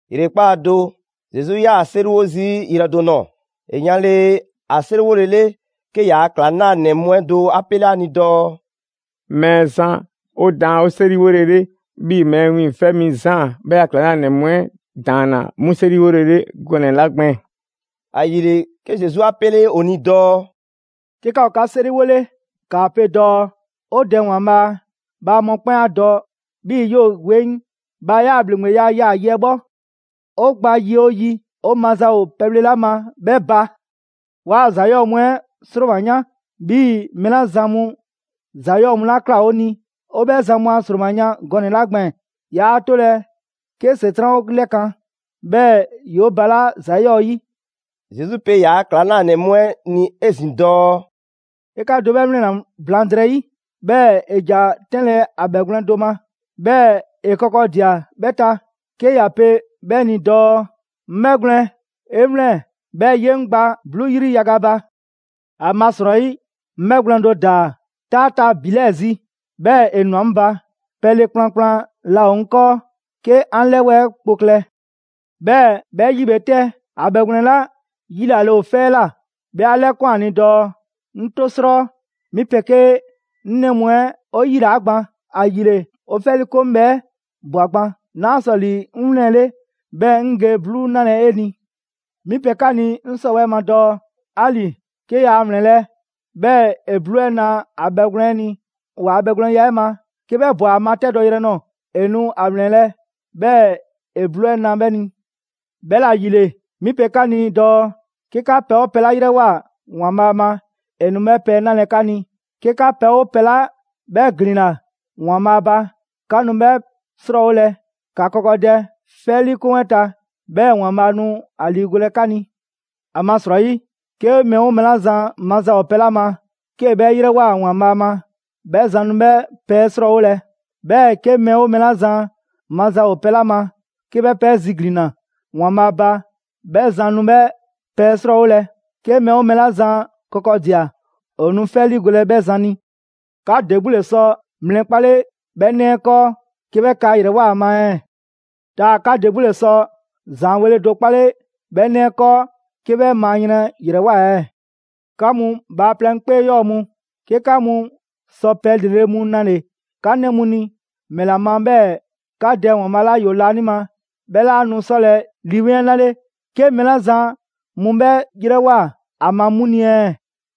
‑Yrekpaa' do, Zesu 'yaa‑ 'seriwo zii' yrɛ do ꞊nɔɔ. ‑E yanle ‑a 'seriwolele, 'ke ‑yaa' ‑klaŋlanɛ mu 'ɛ do 'a 'pele ‑a ni dɔɔ: «Mɛɛzan, 'o daan 'o 'seriwolele, 'bhii‑ Mɛɛ Wiiŋfɛ' Mi Zaan bhɛ a ‑klaŋlanɛ mu 'ɛ ‑daanna 'mu 'seriwolele gɔnɛ‑ 'la gbɛɛn‑.» ‑Ayile, 'ke Zesu 'a 'pele ‑o ni dɔɔ: «'Ke 'ka ‑o 'ka 'seriwole ‑kaa pe dɔɔ: ‹'O Dɛ ‑Waanbhaa', bhaa mɔkpɛn' 'a dɔ 'bhii‑ 'yoo‑ 'weŋ! Bhaa 'yaa‑ ‑bhleŋgbeya yaa‑ yi 'ɛ 'bhɔ. 'O gba yi oo yi, 'o maza ‑o pɛbhle 'la ma 'bhɛ ba! 'Waa‑ ‑za 'yɔɔ mu 'ɛ ‑sroma 'yan, 'bhii‑ mɛɛ 'la zan mu ‑za 'yɔɔ mu ꞊kla 'o ni 'o 'bhɛ zan mu a ‑sroma yan gɔnɛ‑ 'la gbɛɛn‑. 'Yaa 'tolɛ‑ 'ke ‑Setran' 'o 'lɛkan‑, 'bhɛɛ‑ ‑yoo' balaa' ‑za 'yɔɔ‑ 'yi.›» Zesu pe ‑yaa' ‑klaŋlanɛ mu 'ɛ ni 'ezin‑ dɔɔ: «'Ke 'ka do 'bhɛ 'wlɛnna‑ blaŋdrɛyi, 'bhɛɛ‑ ‑e ‑ja 'tɛnlɛ‑ ‑a bhɛgwlɛn do ma, 'bhɛɛ‑ ‑e kɔkɔdia 'bhɛ ta, 'ke ‑ya pe 'bhɛ ni dɔɔ: ‹'Ŋ 'bhɛgwlɛn‑, 'e 'wlɛn‑, 'bhɛɛ‑ 'ye 'ŋ gba 'bluu 'yri yaga ba. ‑Amasrɔyi 'ŋ 'bhɛgwlɛn‑ do ‑daa 'taa ta ‑bi 'lɛɛ‑ zi, 'bhɛɛ‑ ‑e ꞊nwa 'ŋ ba. Pɛle kplankplan laa ‑o 'ŋ 'kɔɔ 'ke 'an 'lɛwɛɛ kpo klɛ.› 'Bhɛɛ‑ 'bhɛ 'yi bhe 'tɛ, ‑a bhɛgwlɛn 'la 'yilale ‑o 'fɛ 'ɛ ꞊la, 'bhɛ 'a 'lɛkun ‑a ni dɔɔ: ‹'Ŋ 'to 'srɔ! 'Mi 'pegee 'ŋ 'nɛ mu 'ɛ 'o 'yilaa‑ gban, ‑ayile 'o 'fɛ 'liikoŋ bhɛ 'ɛ ꞊bwa gban. 'Naa sɔ ‑li 'ŋ 'wlɛnle, 'bhɛɛ‑ 'ŋ ge 'bluu 'nalɛ‑ 'e ni.› 'Mi pe 'ka ni 'ŋ 'sɔwɛɛ‑ ma dɔɔ: 'Ali‑ 'ke yaa ‑wlɛnlɛ', 'bhɛɛ‑ ‑e 'bluu 'ɛ na ‑a bhɛgwlɛn 'ɛ ni ‑waa' bhɛgwlɛnya 'ɛ ma; 'ke 'bhɛ ꞊bwa ‑a matɛdɔ yrɛ nɔɔ‑, ‑e nu ‑a ‑wlɛnlɛ', 'bhɛɛ‑ ‑e 'bluu 'ɛ na 'bhɛ ni. 'Bhɛla‑ ‑yile 'mi pe 'ka ni dɔɔ 'ke 'ka pɛ 'oo pɛ 'la 'yrɛwoa‑ ‑Waanbhaa' ma, ‑e nu 'bhɛ pɛ 'ɛ 'nalɛ‑ 'ka ni. 'Ke 'ka pɛ 'oo pɛ 'la 'bhɛ ‑glinna ‑Waanbhaa' ba, 'ka nu 'bhɛɛ‑ 'srɔɔwolɛ. ‑Ka kɔkɔdɛ 'fɛ 'liikoŋ 'ɛ ta, 'bhɛɛ‑ ‑Waanbhaa' nu ‑a ‑liigolɛ 'ka ni. ‑Amasrɔyi, 'ke mɛɛ 'oo mɛɛ 'la zan maza ‑o pɛ 'la ma, 'kee‑ 'bhɛ 'yrɛwoa‑ ‑Waanbhaa' ma, 'bhɛ zan nu 'bhɛ pɛ 'ɛ 'srɔɔwolɛ. 'Bhɛɛ‑ 'ke mɛɛ 'oo mɛɛ 'la zan maza ‑o pɛ 'la ma 'kee‑ 'bhɛ pɛ 'ɛ ziglinna ‑Waanbhaa' ba, 'bhɛ zan nu 'bhɛ pɛ 'ɛ 'srɔɔwolɛ; 'ke mɛɛ 'oo mɛɛ 'la zan kɔkɔdia, ‑o nu 'fɛ 'ɛ 'liigolɛ 'bhɛ zan ni. 'Ka ‑de 'gbu ‑le sɔ mlɛ 'kpale 'bhɛ 'nɛ 'ɛ 'kɔɔ, 'ke 'bhɛ kaa ‑yrɛwoa ‑a ma ɛɛ? ‑Taa 'ka ‑de 'gbu ‑le sɔ ‑zaanweele do 'kpale 'bhɛ 'nɛ 'ɛ 'kɔɔ 'ke 'bhɛ maa yrɛn ‑yrɛwoa ‑a ɛɛ? 'Ka mu bhaaplɛŋ 'kpee 'yɔɔ‑ mu, 'ke 'ka mu sɔ pɛ ‑lrele' mu nale‑ 'ka 'nɛ mu ni, ‑mɛla ma 'bhɛɛ‑ 'ka Dɛ ‑Waanbhaa' 'la ‑yoo laanima 'bhɛ 'laa nu 'sɔlɛ‑ Lii 'Weŋ 'ɛ 'nale 'ke mɛɛ 'la zan mu 'bhɛ 'yrɛwoa‑ ‑a ma 'mu ni ɛɛ?»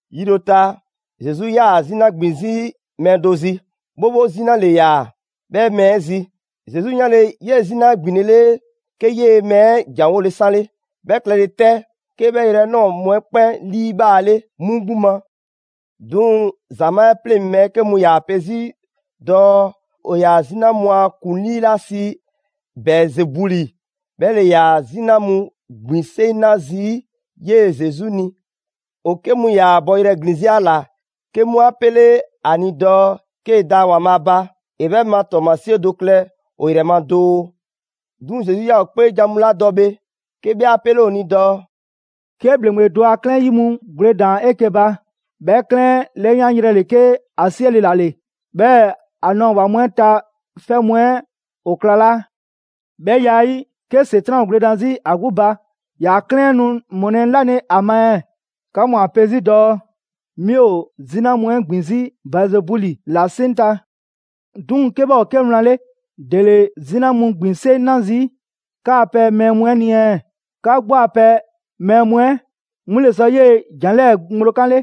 Yi do ta, Zesu 'yaa‑ 'zina ‑gbin 'zi mɛɛ do zi. 'Bhobho 'zina ‑le ‑yaa 'bhɛ mɛɛ 'ɛ zi. Zesu 'yanle‑ 'yee‑ 'zina 'ɛ ‑gbinlele, 'ke 'yee‑ mɛɛ 'ɛ ‑janwole 'sanle. 'Bhɛ klɛle 'tɛ, 'ke 'bhɛ yrɛ 'ɛ ꞊nɔɔ mu 'ɛ 'kpɛn 'liibhaale 'mu 'gbu ma. 'Duŋ‑ ‑zamaa' 'ɛ 'pleŋ‑ mɛɛ 'ke mu ‑yaa pe 'zi dɔɔ ‑o ‑yaa 'zina mu a ‑kuŋlii 'la sii Bɛɛzebuli 'bhɛ ‑le ‑yaa 'zina mu ‑gbin 'seŋ 'na zii' 'yee‑ Zesu ni. ‑O 'ke mu ‑yaa bɔyrɛ ‑glin 'zi ‑a ‑la 'ke mu 'a 'pele ‑a ni dɔɔ 'kee‑ da ‑Waanbhaa' ba, ‑e 'bhɛ ma ‑tɔɔmasie do klɛ ‑o ‑yrɛ ma doo. 'Duŋ‑ Zesu 'yaa‑ ‑o 'kpeejan‑ mu 'la dɔ bhe, 'ke 'bhɛ 'a 'pele ‑o ni dɔɔ: «'Ke ‑bhleŋgbe do a 'klɛɛn ‑yi mu gwledan 'eke‑ ba, 'bhɛ 'klɛɛn 'ɛ 'lɛyanyrɛ ‑le 'ke ‑a 'siɛle‑ ‑la ‑le, 'bhɛɛ‑ ‑a nɔɔ‑ ‑wa mu 'ɛ ta 'fɛ mu 'ɛ ‑o ‑klalaa'. 'Bhɛ ya 'ɛ 'yi, 'ke ‑Setran' gwledan 'zi ‑a 'gbu ba, ‑yaa' 'klɛɛn nu ‑mɔlɛ' 'nale‑ ‑a ma ɛɛ? 'Ka mu ‑a pe 'zi dɔɔ 'mi ‑o 'zina mu 'ɛ ‑gbin 'zi Bɛɛzebuli ‑la 'seŋ ta. 'Duŋ‑ 'ke 'bhɛ ‑o 'ke wlan 'le, ‑dele 'zina mu ‑gbin 'seŋ 'na zii' 'ka a pɛ mɛɛ mu 'ɛ ni ɛɛ? 'Ka 'gbu a pɛ mɛɛ mu 'ɛ 'mu ‑le sɔ 'yee‑ ‑jan 'lɛɛ‑ ŋgblo 'kanle.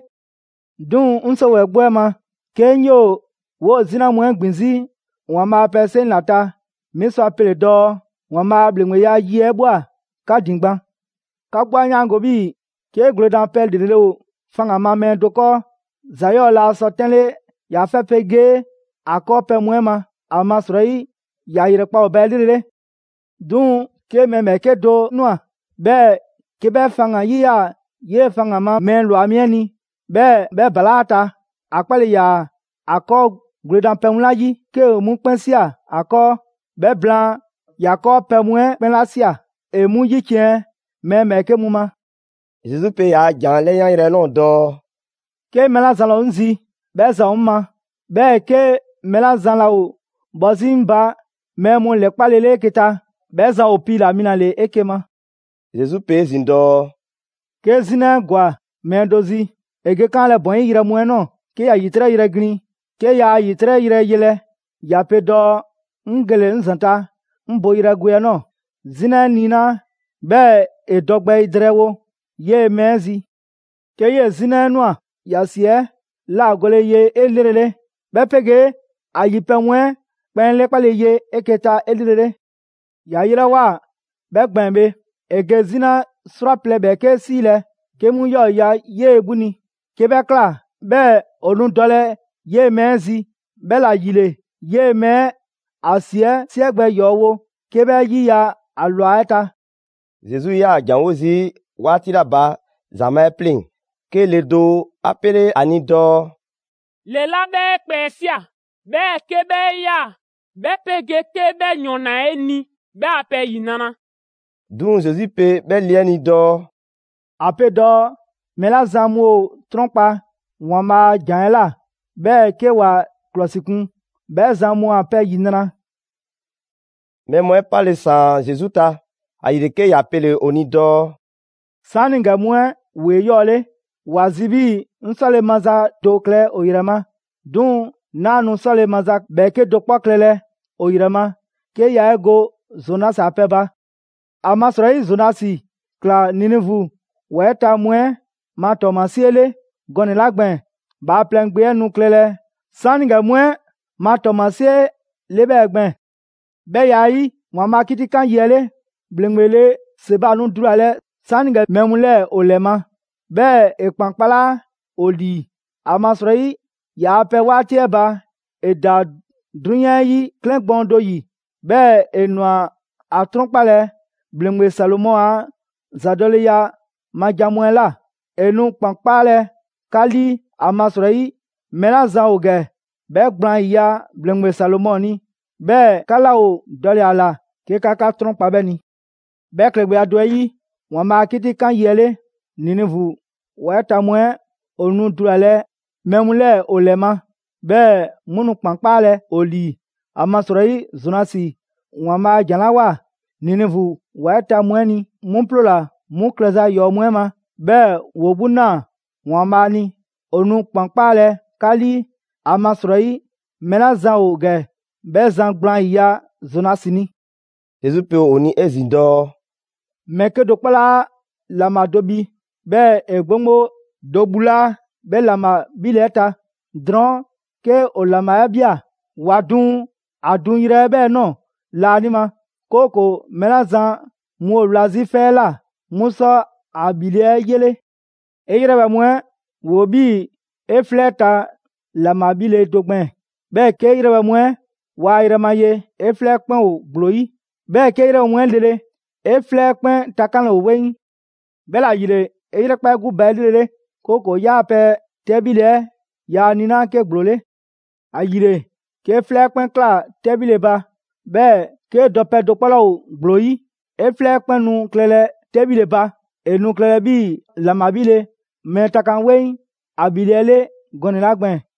'Duŋ‑ 'ŋ 'sɔwɛɛ‑ 'gbu 'ɛ ma, 'ke 'ŋ 'yoo‑ 'woo‑ 'zina mu 'ɛ ‑gbin 'zi ‑Waanbhaa' a pɛ 'seŋ ‑la ta, 'mi sɔ a pele‑ dɔɔ ‑Waanbhaa' a ‑bhleŋgbeya yi 'ɛ ꞊bhwa 'ka ‑din gban.» «'Ka 'gbu 'a 'yaango‑ 'bhii‑ 'ke gwledanpɛ ‑lrele' ‑o ‑faŋgan ma mɛɛ do 'kɔɔ, ‑za 'yɔɔ‑ laa sɔ 'tɛnle ‑yaa' 'fɛ 'pegee ‑a 'kɔɔpɛ‑ mu 'ɛ ma, ‑amasrɔyi ‑ya ‑yrɛkpa' ‑o ba 'elrele. 'Duŋ‑ 'ke mɛɛ ‑bhɛɛke' do ꞊nwa 'bhɛɛ‑ 'ke 'bhɛ faŋgan‑ 'yiya‑ 'yee‑ faŋgan‑ ma mɛɛ ‑lwa mi 'ɛ ni; 'bhɛɛ‑ 'bhɛ ‑balaa' ‑a ta. ‑A 'kpale‑ ‑yaa ‑a 'kɔɔ gwledanpɛ mu 'la 'yi, 'kee‑ 'mu 'kpɛn ꞊sia 'a 'kɔɔ. 'Bhɛ blaan, ‑ya 'kɔɔpɛ‑ mu 'ɛ 'kpɛn 'la ꞊sia ‑e 'mu 'yiciɛn‑ mɛɛ ‑bhɛɛke' mu ma.» Zesu pe ‑yaa' ‑jan 'ɛ 'lɛyanyrɛ 'ɛ ꞊nɔɔ dɔɔ: «'Ke mɛɛ 'la zan laa ‑o 'ŋ zi, 'bhɛ zan ‑o 'ŋ ma. 'Bhɛɛ‑ 'ke mɛɛ 'la zan laa ‑o bhɔ 'zi 'ŋ ba mɛɛ mu ‑lɛkpalele 'eke‑ ta, 'bhɛ zan ‑o piila‑ mi ‑la ‑le 'eke‑ ma.» Zesu pe 'ezin‑ dɔɔ: «'Ke 'zina 'ɛ ‑gwa mɛɛ do zi, ‑e ge 'kaanlɛ‑ ‑bɔn 'yi yrɛ mu 'ɛ ꞊nɔɔ 'ke ‑ya ‑yitrɛ' yrɛ glin. 'Ke yaa ‑yitrɛ' yrɛ yelɛ, ‑ya pe dɔɔ: ‹'Ŋ gele‑ 'ŋ ‑zanta' 'ŋ boyrɛ gwe 'ɛ ꞊nɔɔ›. 'Zina 'ɛ 'niinaa, 'bhɛɛ‑ ‑e dɔ gbɛ drɛɛwo 'yee‑ mɛɛ 'ɛ zi. 'Ke 'yee‑ 'zina 'ɛ ꞊nwa, ‑ya ‑si 'ɛ ‑lagole ye 'elrele, 'bhɛ 'pegee ‑a ‑yi pɛ mu 'ɛ 'kpɛn 'lɛkpale ye 'eke‑ ta 'elrele. ‑Ya yelawoa 'bhɛ gbɛɛn‑ bhe, ‑e ge 'zina 'srwaplɛ‑ ‑bhɛɛke' 'siilɛ‑ 'ke 'mu ‑yɔɔ' ‑yiya' 'yee 'gbu ni. 'Ke 'bhɛ ꞊kla, 'bhɛɛ‑ ‑o nu dɔlɛ 'yee‑ mɛɛ 'ɛ zi. 'Bhɛla‑ ‑yile 'yee‑ mɛɛ ‑a ‑si 'ɛ 'siɛ gbɛ ‑yɔɔ' wo 'ke 'bhɛ 'yiya‑ ‑a ‑lwa 'ɛ ta.» Zesu 'yaa‑ ‑janwo' zii' 'waati 'la ba ‑zamaa' 'ɛ 'pleŋ‑, 'ke le do 'a 'pele ‑a ni dɔɔ: «Le 'la 'bhɛ 'e kpɛ 'ɛ ꞊sia, 'bhɛɛ‑ 'ke 'bhɛ 'e ꞊yaa, 'bhɛ 'pegee 'ke 'bhɛ ‑yɔn ‑naa 'e ni, 'bhɛ a pɛ ‑yinra'!» 'Duŋ‑ Zesu pe 'bhɛ le 'ɛ ni dɔɔ: «‑A pe dɔɔ mɛɛ 'la zan mu ‑o 'trɔnkpa‑ ‑Waanbhaa' a ‑jan 'ɛ ꞊la, 'bhɛɛ‑ 'ke ‑wa ‑klɔsikun, 'bhɛɛ‑ zan mu a pɛ ‑yinra'.» Mɛɛ mu 'ɛ 'pale‑ ꞊saan Zesu ta, ‑ayile 'ke ‑ya pele‑ ‑o ni dɔɔ: «'Saanigɛ mu 'ɛ ‑woo 'eyɔɔle. ‑Wa zi 'bhii‑ 'ŋ 'sɔle‑ maza do klɛ ‑o ‑yrɛ ma. 'Duŋ‑ 'naa nu 'sɔle‑ maza ‑bhɛɛke' do 'kpɔ klɛlɛ ‑o ‑yrɛ ma, 'ke yaa 'e go Zonasi a pɛ 'ɛ ba. ‑Amasrɔyi Zonasi ‑kla Ninivu ‑wa 'ɛ ta mu 'ɛ ma ‑tɔɔmasie 'le gɔnɛ‑ 'la gbɛɛn‑, Bhaaplɛŋ Gbe 'ɛ nu klɛlɛ 'saanigɛ mu 'ɛ ma ‑tɔɔmasie 'le 'bhɛɛ‑ gbɛɛn‑. 'Bhɛ ya 'ɛ 'yi, ‑Waanbhaa' a 'kitikan yi 'ɛ 'le, ‑bhleŋgbe le Seba nu dulalɛ 'saanigɛ mɛɛ mu 'lɛɛ‑ ‑o ‑lɛ ma, 'bhɛɛ‑ ‑e ‑kpan kpalaa' ‑o ‑lii. ‑Amasrɔyi ‑yaa' pɛ 'waati 'ɛ ba ‑e ‑daa 'drunyan 'ɛ 'yi 'klɛɛn gbɔɔn do ‑yi, 'bhɛɛ‑ ‑e ꞊nwa ‑a 'trɔnkpalɛ ‑bhleŋgbe Salomɔ a ‑zadɔleya ma jan mu 'ɛ ꞊la. ‑E nu ‑kpan 'kpaalɛ‑ 'ka 'lii, ‑amasrɔyi mɛɛ 'la zan ‑o ‑gɛ 'bhɛ gblaan 'yiya‑ ‑bhleŋgbe Salomɔ ni, 'bhɛɛ‑ 'ka 'laa ‑o dɔle‑ ‑a ‑la 'ke 'ka 'trɔnkpa 'bhɛ ni. 'Bhɛ klɛgbɛya do 'ɛ 'yi, ‑Waanbhaa' a 'kitikan yi 'ɛ 'le, Ninivu ‑wa 'ɛ ta mu 'ɛ ‑o nu dulalɛ mɛɛ mu 'lɛɛ‑ ‑o 'lɛ ma, 'bhɛɛ‑ 'mu nu ‑kpan 'kpaalɛ‑ ‑o ‑lii. ‑Amasrɔyi Zonasi ‑Waanbhaa' a ‑jan 'la ꞊woa Ninivu ‑wa 'ɛ ta mu 'ɛ ni, 'mu 'ploola‑ 'mu klɛza ‑yɔɔ' mu 'ɛ ma, 'bhɛɛ‑ ‑woo 'gbu ꞊naa ‑Waanbhaa' ni. ‑O nu ‑kpan 'kpaalɛ 'ka 'lii, ‑amasrɔyi mɛɛ 'la zan ‑o ‑gɛ, 'bhɛ zan gblaan 'yiya‑ Zonasi ni.» Zesu pe ‑o ni 'ezin‑ dɔɔ: «Mɛɛ 'kedo‑ 'kpɔ 'laa ‑laŋbha do bhi, 'bhɛɛ‑ ‑e 'gboŋgbo do bhulaa' 'bhɛ ‑laŋbha 'bhile‑ 'ɛ ta. Drɔɔn' 'ke ‑o ‑laŋbha 'ɛ ꞊bhia, ‑wa duŋ ‑a duŋyrɛ 'ɛ 'bhɛɛ‑ ꞊nɔɔ laanima, 'kooko‑ mɛɛ 'la zan mu ‑o wla 'zi 'fɛ 'ɛ ꞊la, 'mu sɔ ‑a ‑bhile' 'ɛ 'yele. 'E 'yrɛbhɛ‑ mu 'ɛ ‑woo 'bhii‑ 'e 'flɛ 'ɛ ta ‑laŋbha 'bhile‑ do gbɛɛn‑. 'Bhɛɛ‑ 'kee‑ 'yrɛbhɛ‑ mu 'ɛ waa yrɛma ye, 'e 'flɛ 'ɛ 'kpɛn ‑o ‑gblo 'yi. 'Bhɛɛ‑ 'kee 'yrɛbhɛ‑ mu 'ɛ lele, 'e 'flɛ 'ɛ 'kpɛn takanle ‑o 'weŋ. 'Bhɛla‑ ‑yile, 'e 'yrɛkpa 'e 'gbu ba 'elrele, 'kooko‑ 'yaa‑ pɛ 'tɛbhile 'ɛ yaa niinaa' 'ke ‑gblo 'le. ‑Ayile, 'kee 'flɛ 'ɛ 'kpɛn ꞊kla 'tɛbhile ba, 'bhɛɛ‑ 'kee dɔpɛ do 'kpɔ 'laa ‑o ‑gblo 'yi, 'e 'flɛ 'kpɛn nu klɛlɛ 'tɛbhile ba. ‑E nu klɛlɛ 'bhii‑ ‑laŋbha 'bhile‑ mɛɛ takan 'weŋ ‑a ‑bhile' 'ɛ 'le gɔnɛ‑ 'la gbɛɛn‑.»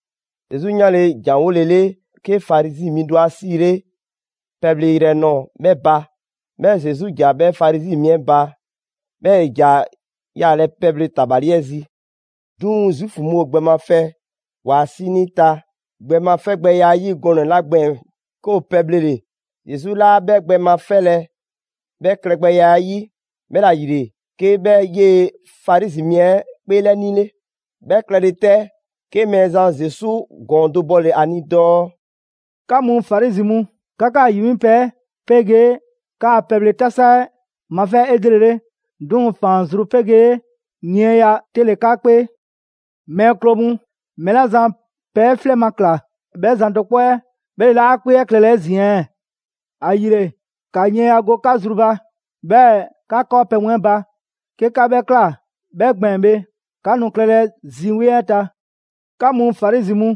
Zesu 'yanle‑ ‑janwolele 'ke Farizi mi do 'a 'siile pɛ bhle yrɛ nɔɔ‑ 'bhɛ ba. 'Bhɛɛ‑ Zesu ‑ja 'bhɛ Farizi mi 'ɛ ba, 'bhɛɛ‑ ‑e ‑ja yaalɛ pɛbhle tabali 'ɛ zi. 'Duŋ‑ Zuufu mu ‑o gbɛ mafɛ ‑waa' 'sinii ta gbɛ ma 'fɛgbɛya 'ɛ 'yi gɔnɛ‑ 'la gbɛɛn‑ 'ke ‑woo pɛbhlele, Zesu 'laa 'bhɛ gbɛ ma 'fɛlɛ‑ 'bhɛ klɛgbɛya 'ɛ 'yi. 'Bhɛla‑ ‑yile, 'ke 'bhɛ 'yee‑ ‑Farizi mi 'ɛ 'kpeelɛnile. 'Bhɛ klɛle 'tɛ, 'ke Mɛɛzan Zesu ‑gɔɔn do bɔle‑ ‑a ni dɔɔ: «'Ka mu Farizi mu, 'ka 'kaa‑ ‑yi 'mi pɛ 'ɛ 'pegee 'kaa‑ pɛbhle 'tasa 'ɛ mafɛ 'elrele, 'duŋ‑ ‑faan zru 'pegee yiɛnya 'te ‑le 'ka 'kpee. Mɛɛ kloo mu! Mɛɛ 'la zan pɛ 'ɛ 'flɛ ma ꞊kla, 'bhɛ zan do 'kpɔ 'ɛ 'bhɛ ‑le 'laa ‑a 'kpee 'ɛ klɛlɛ 'ezin‑ ɛɛ? ‑Ayile, ‑ka yiɛnya go 'ka zru ba, 'bhɛɛ‑ ‑ka 'kɔɔfleŋzan mu gba 'ka 'kɔɔpɛ‑ mu 'ɛ ba. 'Ke 'ka 'bhɛ ꞊kla 'bhɛ gbɛɛn‑ bhe, 'ka nu klɛlɛ zi 'weŋ 'ɛ ta.» «'Ka mu Farizi mu,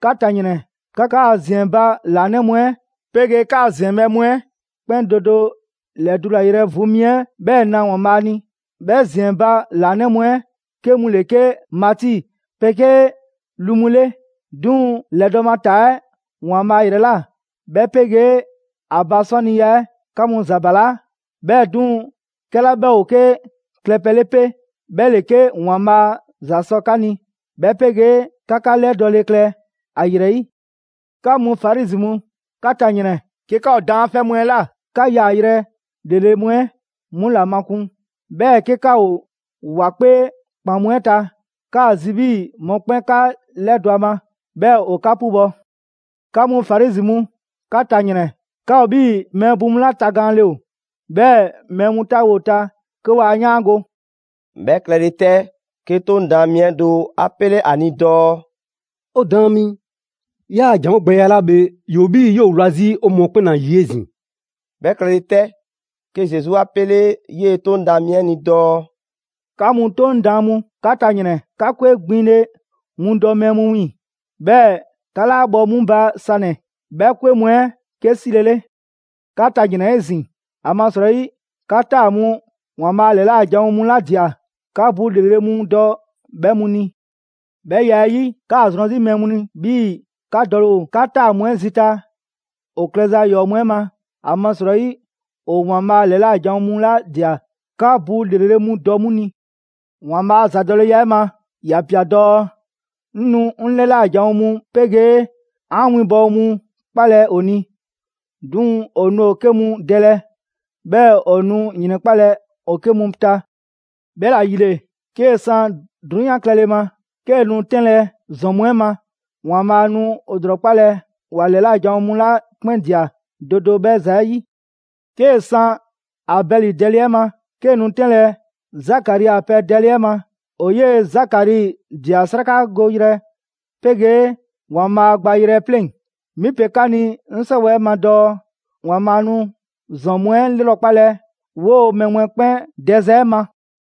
'ka ta ‑yrɛn! 'Ka 'kaa‑ ‑ziɛn ba ‑laanɛ' mu 'ɛ, 'pegee 'kaa‑ ‑ziɛnbhɛ' mu 'ɛ 'kpɛn do do ‑lɛdulayrɛ vu mi 'ɛ 'bhɛɛ‑ na Waanbhaa' ni; 'bhɛ ‑ziɛn ba ‑laanɛ' mu 'ɛ 'ke mu ‑le 'ke mati 'pegee lu mu 'le. 'Duŋ‑ ‑lɛdɔɔ' ma 'taa 'ɛ ‑Waanbhaa' ‑yrɛ ꞊la, 'bhɛ 'pegee ‑a ba 'sɔniya 'ɛ, 'ka 'mu ‑za balaa'. 'Bhɛɛ‑ 'duŋ‑, 'kɛla 'bhɛ ‑o 'ke klɛ pɛ 'le 'pe, 'bhɛ ‑le 'ke ‑Waanbhaa' ‑za 'sɔ 'ka ni, 'bhɛ 'pegee 'ke 'ka 'lɛdɔɔle klɛ ‑a ‑yrɛ 'yi.» «'Ka mu Farizi mu, 'ka ta ‑yrɛn! 'Ke 'ka ‑o daanfɛ' mu 'ɛ ꞊la, 'ka yaayrɛ ‑lrele' mu 'ɛ 'mu ‑la makun. 'Bhɛɛ‑ 'ke 'ka ‑o ‑wa 'kpee ‑kpan mu 'ɛ ta, 'kaa‑ zi 'bhii‑ mɔkpɛn' 'ka 'lɛdɔ‑ ‑a ma, 'bhɛɛ‑ ‑o 'ka 'pubɔ‑. 'Ka mu Farizi mu, 'ka ta ‑yrɛn! 'Ka ‑o 'bhii‑ mɛɛ bu mu 'la tagaanle ‑o; 'bhɛɛ‑ mɛɛ mu 'taawo‑ ‑o ta 'ke waa 'yaango‑.» 'Bhɛ klɛle 'tɛ, 'ke 'Toŋ daan mi 'ɛ do 'a 'pele ‑a ni dɔɔ: «'O Daan mi, 'yaa‑ ‑janwogbɛya 'la bhe, ‑yoo 'bhii‑ 'yoo‑ wla 'zi 'o mɔɔ 'kpɛn ‑la ‑yi 'ezin‑.» 'Bhɛ klɛle 'tɛ, 'ke Zesu 'a 'pele 'yee‑ 'Toŋ daan mi 'ɛ ni dɔɔ: «'Ka mu 'Toŋ daan mu, 'ka ta ‑yrɛn! 'Ka 'kwe gbinle mu dɔ mɛɛ mu wiiŋ‑, 'bhɛɛ‑ 'ka 'laa bhɔ 'mu ba sanɛ‑ 'bhɛ 'kwe mu 'ɛ 'ke 'silele. 'Ka ta ‑yrɛn 'ezin‑! ‑Amasrɔyi 'ka 'taa‑ mu ‑Waanbhaa' ‑lɛla' janwo mu 'la ꞊dia, 'ka bu ‑lrele' mu dɔ 'bhɛ mu ni. 'Bhɛ ya 'ɛ 'yi, 'kaa‑ zrɔn 'zi mɛɛ mu ni 'bhii‑ 'ka dɔle ‑o 'ka 'taa‑ mu 'ɛ zita ‑o klɛza ‑yɔɔ' mu 'ɛ ma. ‑Amasrɔyi ‑o ‑Waanbhaa' ‑lɛla' janwo mu 'la ꞊dia, 'ka bu ‑lrele' mu dɔ mu ni. ‑Waanbhaa' a ‑zadɔleya 'ɛ ma ‑ya ꞊pia dɔɔ: ‹'Ŋ nu 'ŋ 'lɛla janwo mu 'pegee 'an winbɔwo mu 'kpalɛ‑ ‑o ni. 'Duŋ‑ ‑o nu ‑o 'ke mu dɛlɛ, 'bhɛɛ‑ ‑o nu ‑yrɛnkpalɛ ‑o 'ke mu ta.› 'Bhɛla‑ ‑yile, 'kee‑ san 'drunyan klɛle ma, 'kee‑ nu 'tɛnlɛ‑ ‑zɔn mu 'ɛ ma, ‑Waanbhaa' nu ‑o ‑lrɔkpalɛ ‑wa ‑lɛla' janwo mu 'la 'kpɛn ꞊dia do do 'bhɛ za 'ɛ 'yi. 'Kee‑ san Abɛli dɛle 'ɛ ma, 'kee‑ nu 'tɛnlɛ‑ Zakari a pɛ dɛle 'ɛ ma: ‑o 'yee‑ Zakari ꞊dia 'srakagoyrɛ 'pegee ‑Waanbhaa' gbayrɛ 'ɛ 'pleŋ‑. 'Mi pe 'ka ni 'ŋ 'sɔwɛɛ‑ ma dɔɔ ‑Waanbhaa' nu ‑zɔn mu 'ɛ 'lrɔkpalɛ 'woo‑ mɛɛ mu 'ɛ 'kpɛn dɛza 'ɛ ma.»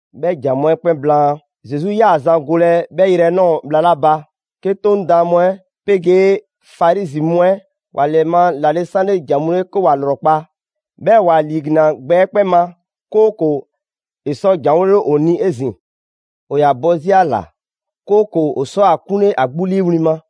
'Bhɛ ‑jan mu 'ɛ 'kpɛn blaan, Zesu 'yaa‑ zan golɛ 'bhɛ yrɛ 'ɛ ꞊nɔɔ bhla 'la ba, 'ke 'Toŋ daan mu 'ɛ 'pegee Farizi mu 'ɛ ‑wa ‑lɛma' ‑lale' 'sanle ‑jan mu 'le 'ke ‑wa ‑lrɔkpa'. 'Bhɛɛ‑ ‑wa ‑liiglinna gbɛ 'ɛ 'kpɛn ma, 'kooko‑ ‑e sɔ ‑janwole ‑o ni 'ezin‑. ‑O ‑yaa bɔ 'zi ‑a ‑la, 'kooko‑ ‑o sɔ ‑a 'kunle ‑a 'gbu 'liiwli‑ ma.